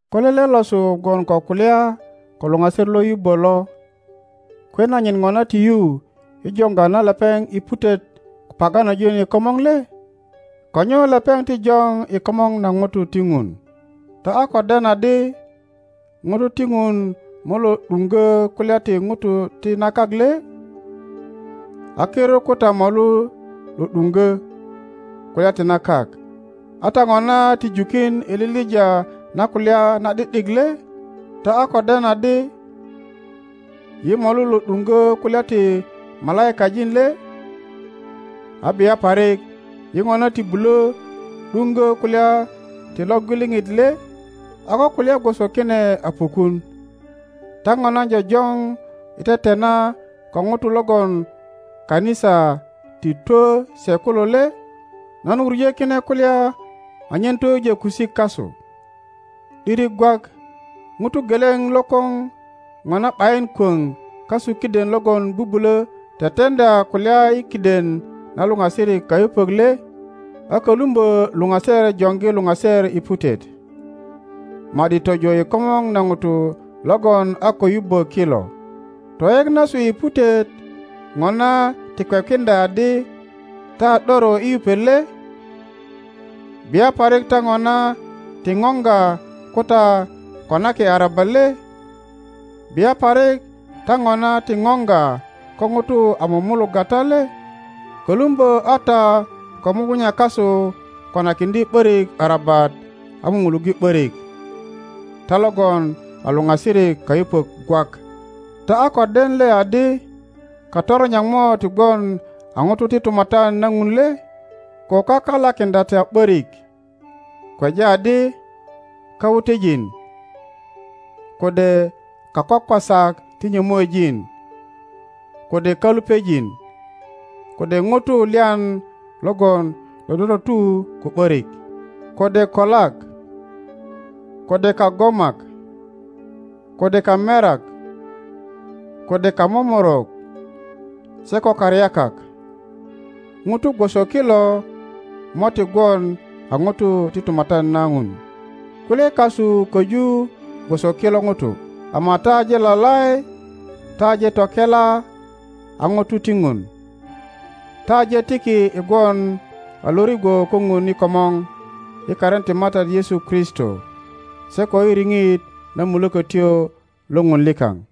Ko lele losu gwon ko kulya ko luŋaser lo yubbö lo, kwe nanyit Ŋona ti yu i joŋga na lepeŋ i putet ko paganojin i komŋo le? Ko nyo lepeŋ joŋ i komor na ŋuto ti Ŋun? Ta a ko den adi ŋutu ti Ŋun mo lo ’duŋgö kulya ti ŋutu ti na kak le? A kirut ko ta molu lo ’duŋgö kulya ti na kak, a ta ŋona ti jukin i lilija na kulya na ’di ’dik le? Ta a ko den adi yi molu lo ’duŋgö kulya ti malaikajin le? A bia parik yi ŋona ti bulö ’duŋgö kulya ti lo gwiliŋit le? A ko kulya gwoso kine a pukun, ta ŋona jojoŋ i tetena ko ŋutu logon kanisa ti twö se kulo le? Nan wuŋö kine kulya anyen toyujö kusik kasu. ’Diri gwak ŋuto geleŋ lokoŋ Ŋona ’bayin kwoŋ kasu kiden logon bubulö teteŋdya kulya i kiden na luŋasirik kayupök le? A kölumbö luŋaser joŋgi luŋaser i putet, ma ’di tojo i komŋo na ŋutu logon a ko yubbö kilo. Toyek nasu i putet ŋona ti kwekiŋdya adi ta a ’doro i yupet le? Bia parik ta ŋona ti ŋoŋga ko ta konaki arabat le? Bia parik ta ŋona ti ŋoŋga ko ŋutu a mumulugga ta le? Kölumbö a ta ko mugunya kasu konakiŋdye ’borik arabat a mumuluŋge ’börik, ta logon a luŋasirik kayupök gwak. Ta a ko den le adi katoronyak mo ti gwon a ŋutu ti tumatyan na Ŋun le? Ko kaka lakiŋdya ta ’börik; kweja adi kawutejin, kode kakwakwasak ti nyömuejin, kode kalupejin, kode ŋutu lyan logon dodototu ko ’börik, kode kolak, kode kagomak, kode kamerak, kode kamomorok, se ko karyakak, ŋutu gwoso kilo mo ti gwon a ŋutu ti tumatyan na Ŋun. Kulye kasu köju gwoso kilo ŋutu, ama ta aje lalai, ta aje tokela a ŋuto ti Ŋun, ta aje tiki i gwon a lo rigwo ko Ŋun i komor i karin ti Matat Yesu Kristo se ko i riŋit na Mulökötyo lo Ŋun likaŋ.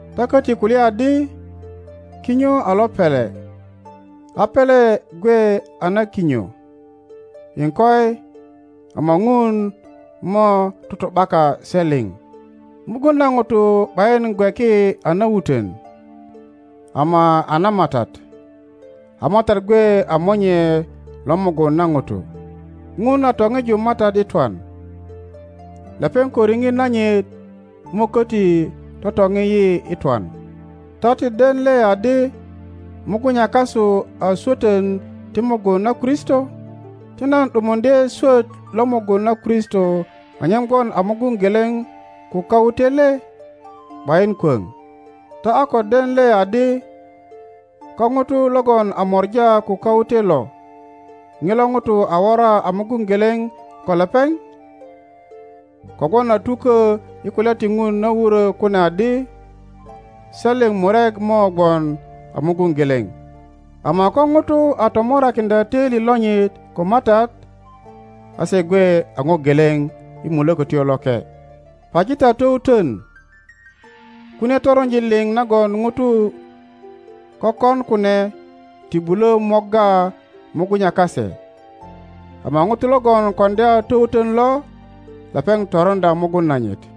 Ta köti kulya adi, Kinyo a lo pele, a pele gwe a na kinyo. Iŋkoi, ama Ŋun mo tutu’baka se liŋ. Mugun na ŋuto ’bayin gweki a na wutön, ama a na Matat, a Matat gwe a monye lo mugun na ŋuto. Ŋun a toŋiju Matat i twan; lepeŋ ko riŋit nanyit mo köti totoŋi yi i twan. Ta ti den le adi mugunya kasu aswötön ti mugun na Kristo? Ti nan ’dumuŋdye swöt lo mugun na Kristo anyen gwon a mugun geleŋ ko kawute le? ’Bayin kwoŋ. Ta a ko den le adi ko ŋuto logon a mora ko kawute lo, ŋilo ŋuto a wora a mugun geleŋ ko lepeŋ? Kogwon a tukö i kulya ti Ŋun na wurö kune adi, Se liŋ murek mo gwon a mugun geleŋ. Ama ko ŋuto a tomorakiŋdya töili lonyit ko Matat, a se gwe a ŋo geleŋ i Mulökötyo Loke. Paji ta towutön. Kunie toronjin liŋ nagon ŋutu kökon kune ti bulö morga mugunya kase, ama ŋuto logon koŋdya towutön lo, lepeŋ toroŋdya mugun nanyit.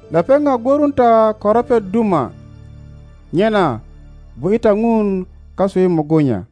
Lepeŋ a gworun ta ko ropet duma, nyena bu ’ye ta Ŋun kasu i mugunya.